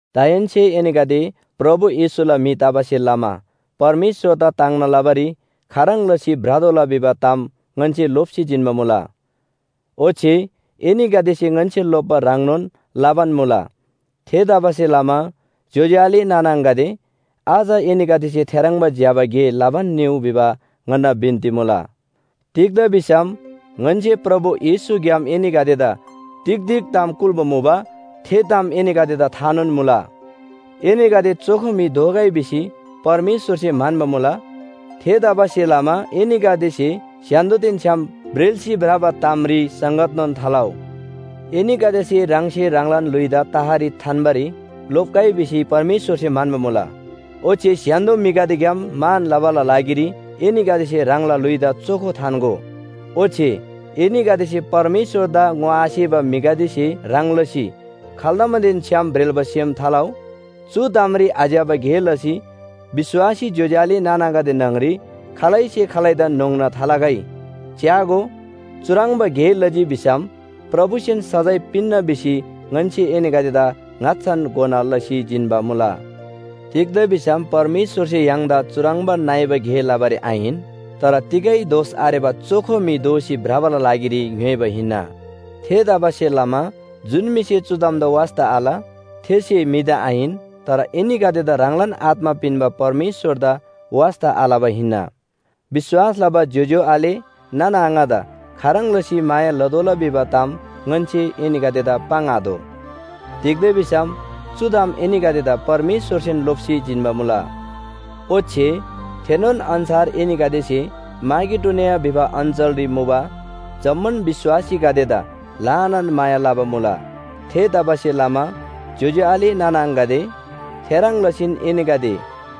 दाहेन्‍से एनीगदे प्रभु येशूला म्‍हि तबासे लमा परमेश्‍वरदा ताङ्ना लबारी खाह्रङ् लसी भ्रतोःला भिबा ताम ङन्‍से लोप्‍सी जिन्‍बा मुला। ओच्‍छे एनीगदेसे ङन्‍से लोप्‍बा ह्रङ्नोन लबान मुला। थेतबासेलमा ज्‍योज्‍यो आले नाना आङागदे, अझ एनीगदेसे थेह्रङ्बा ज्‍यबा गे लबान निउ भिबा ङन्‍ना बिन्‍ती मुला। तिग्‍दा भिसम ङन्‍से प्रभु येशूग्‍याम एनीगदेदा तिग तिग ताम कुल्‍बा मुबा थे ताम एनीगदेदा थानोन मुला। एनीगदे चोखो म्‍हि दोगै भिसी परमेश्‍वरसे म्‍हन्‍बा मुला। थेतबासेलमा एनीगदेसे स्‍य्‍हान्‍दोदेन छ्‌याम ब्रेल्‍सी भ्रबा तामरी संगतनोन थालउ। एनीगदेसे ह्राङसे ह्राङलान ल्‍हुइदा तहरी थान्‍बारी लोप्‍गै भिसी परमेश्‍वरसे म्‍हन्‍बा मुला। ओच्‍छे स्‍य्‍हान्‍दो म्‍हिगदेग्‍याम मान लबाला लागिरी एनीगदेसे ह्राङला ल्‍हुइदा चोखो थान्‍गो। ओच्‍छे एनीगदेसे परमेश्‍वरदा ङोआसेबा म्‍हिगदेसे ह्रङ् लसी खाल्दमनदेन छ्‌याम ब्रेल्‍बा सेम थालउ। चु तामरी आज्‍यबा गे लसी विश्‍वासी ज्‍योज्‍यो आले नाना आङागदे न्‍हङरी खालैसे खालैदान न्‍होङ्ना थालगै। च्‍यागो, चुह्रङ्बा गे लजी भिसम प्रभुसेन सजाय पिन्‍ना भिसी ङन्‍से एनीगदेदा ङाच्‍छान घोना लसी जिन्‍बा मुला। तिग्‍दा भिसम परमेश्‍वरसे य्‍हाङदा चुह्रङ्बा नइबा गे लबारी आहिन, तर तिगै दोष आरेबा चोखो म्‍हि दोसी भ्रबाला लागिरी ङ्‌योइबा हिन्‍ना। थेतबासेलमा जुन म्‍हिसे चु तामदा वास्‍ता आल थेसे म्‍हिदा आहिन, तर एनीगदेदा ह्राङलान आत्‍मा पिन्‍बा परमेश्‍वरदा वास्‍ता आलबा हिन्‍ना। विश्‍वास लबा ज्‍योज्‍यो आले नाना आङादा खाह्रङ् लसी माया लतोःला भिबा ताम ङन्‍से एनीगदेदा पाङ्आतोः। तिग्‍दा भिसम चु ताम एनीगदेदा परमेश्‍वरसेन लोप्‍सी जिन्‍बा मुला। ओच्‍छे थेनोन अन्‍छार एनीगदेसे माकेडोनिया भिबा अञ्‍चलरी मुबा जम्‍मान विश्‍वासीगदेदा ल्‍हानान माया लबा मुला। थेतबासेलमा ज्‍योज्‍यो आले नाना आङागदे, थेह्रङ् लसीन एनीगदे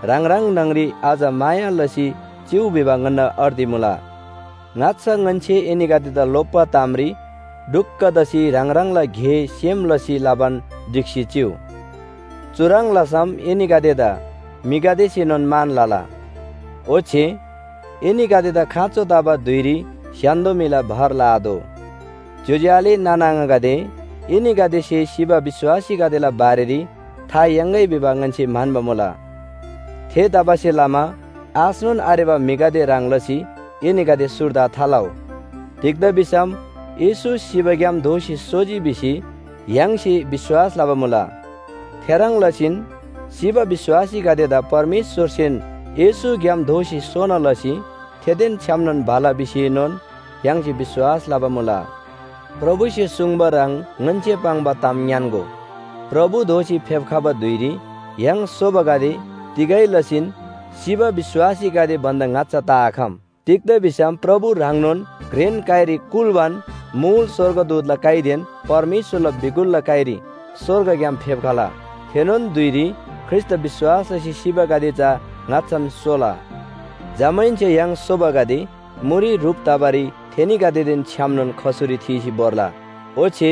ह्राङ ह्राङ न्‍हङरी अझ माया लसी चिउ भिबा ङन्‍ना अर्ती मुला। ङाच्‍छा ङन्‍से एनीगदेदा लोप्‍बा तामरी ढुक्‍क तसी ह्राङ ह्राङला गे सेम लसी लबान ढिक्‍सी चिउ। चुह्रङ् लसम एनीगदेदा म्‍हिगदेसेनोन मान लला। ओच्‍छे एनीगदेदा खाँचो तबा धुइरी स्‍य्‍हान्‍दो म्‍हिला भर लआतोः। ज्‍योज्‍यो आले नाना आङागदे, एनीगदेसे सिबा विश्‍वासीगदेला बारेरी था याङ्‌गै भिबा ङन्‍से म्‍हन्‍बा मुला। थेतबासेलमा आशनोन आरेबा म्‍हिगदे ह्रङ् लसी एनीगदे सुर्दा थालउ। तिग्‍दा भिसम येशू सिबाग्‍याम दोःसी सोजी भिसी य्‍हाङसे विश्‍वास लबा मुला। थेह्रङ् लसीन सिबा विश्‍वासीगदेदा परमेश्‍वरसेन येशूग्‍याम दोःसी सोना लसी थेदेन छ्‌यामनोन भला भिसीएनोन य्‍हाङसे विश्‍वास लबा मुला। प्रभुसे सुङ्बा ह्रङ् ङन्‍से पाङ्बा ताम ङ्‌यान्‍गो, प्रभु दोःसी फेप्‍खबा धुइरी य्‍हाङ सोबागदे तिगै लसीन सिबा विश्‍वासीगदे भन्‍दा ङाच्‍छा तआखम। तिग्‍दा भिसम प्रभु ह्राङनोन घ्रेन काइरी कुल्‍बान मुल स्‍वर्गदूतला काइदेन परमेश्‍वरला बिगुलला काइरी स्‍वर्गग्‍याम फेप्‍खला। थेनोन धुइरी ख्रीष्‍टदा विश्‍वास लसी सिबागदे चा ङाच्‍छान सोला। जमाहेन्‍से य्‍हाङ सोबागदे मुरी ह्रुप तबारी थेनीगदेदेन छ्‌यामनोन खसुरी थीसी भोर्ला। ओच्‍छे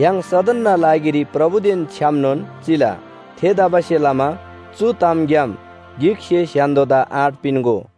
य्‍हाङ सदनना लागिरी प्रभुदेन छ्‌यामनोन चिला। थेतबासेलमा चु तामग्‍याम गिकसे स्‍य्‍हान्‍दोदा आँट पिन्‍गो।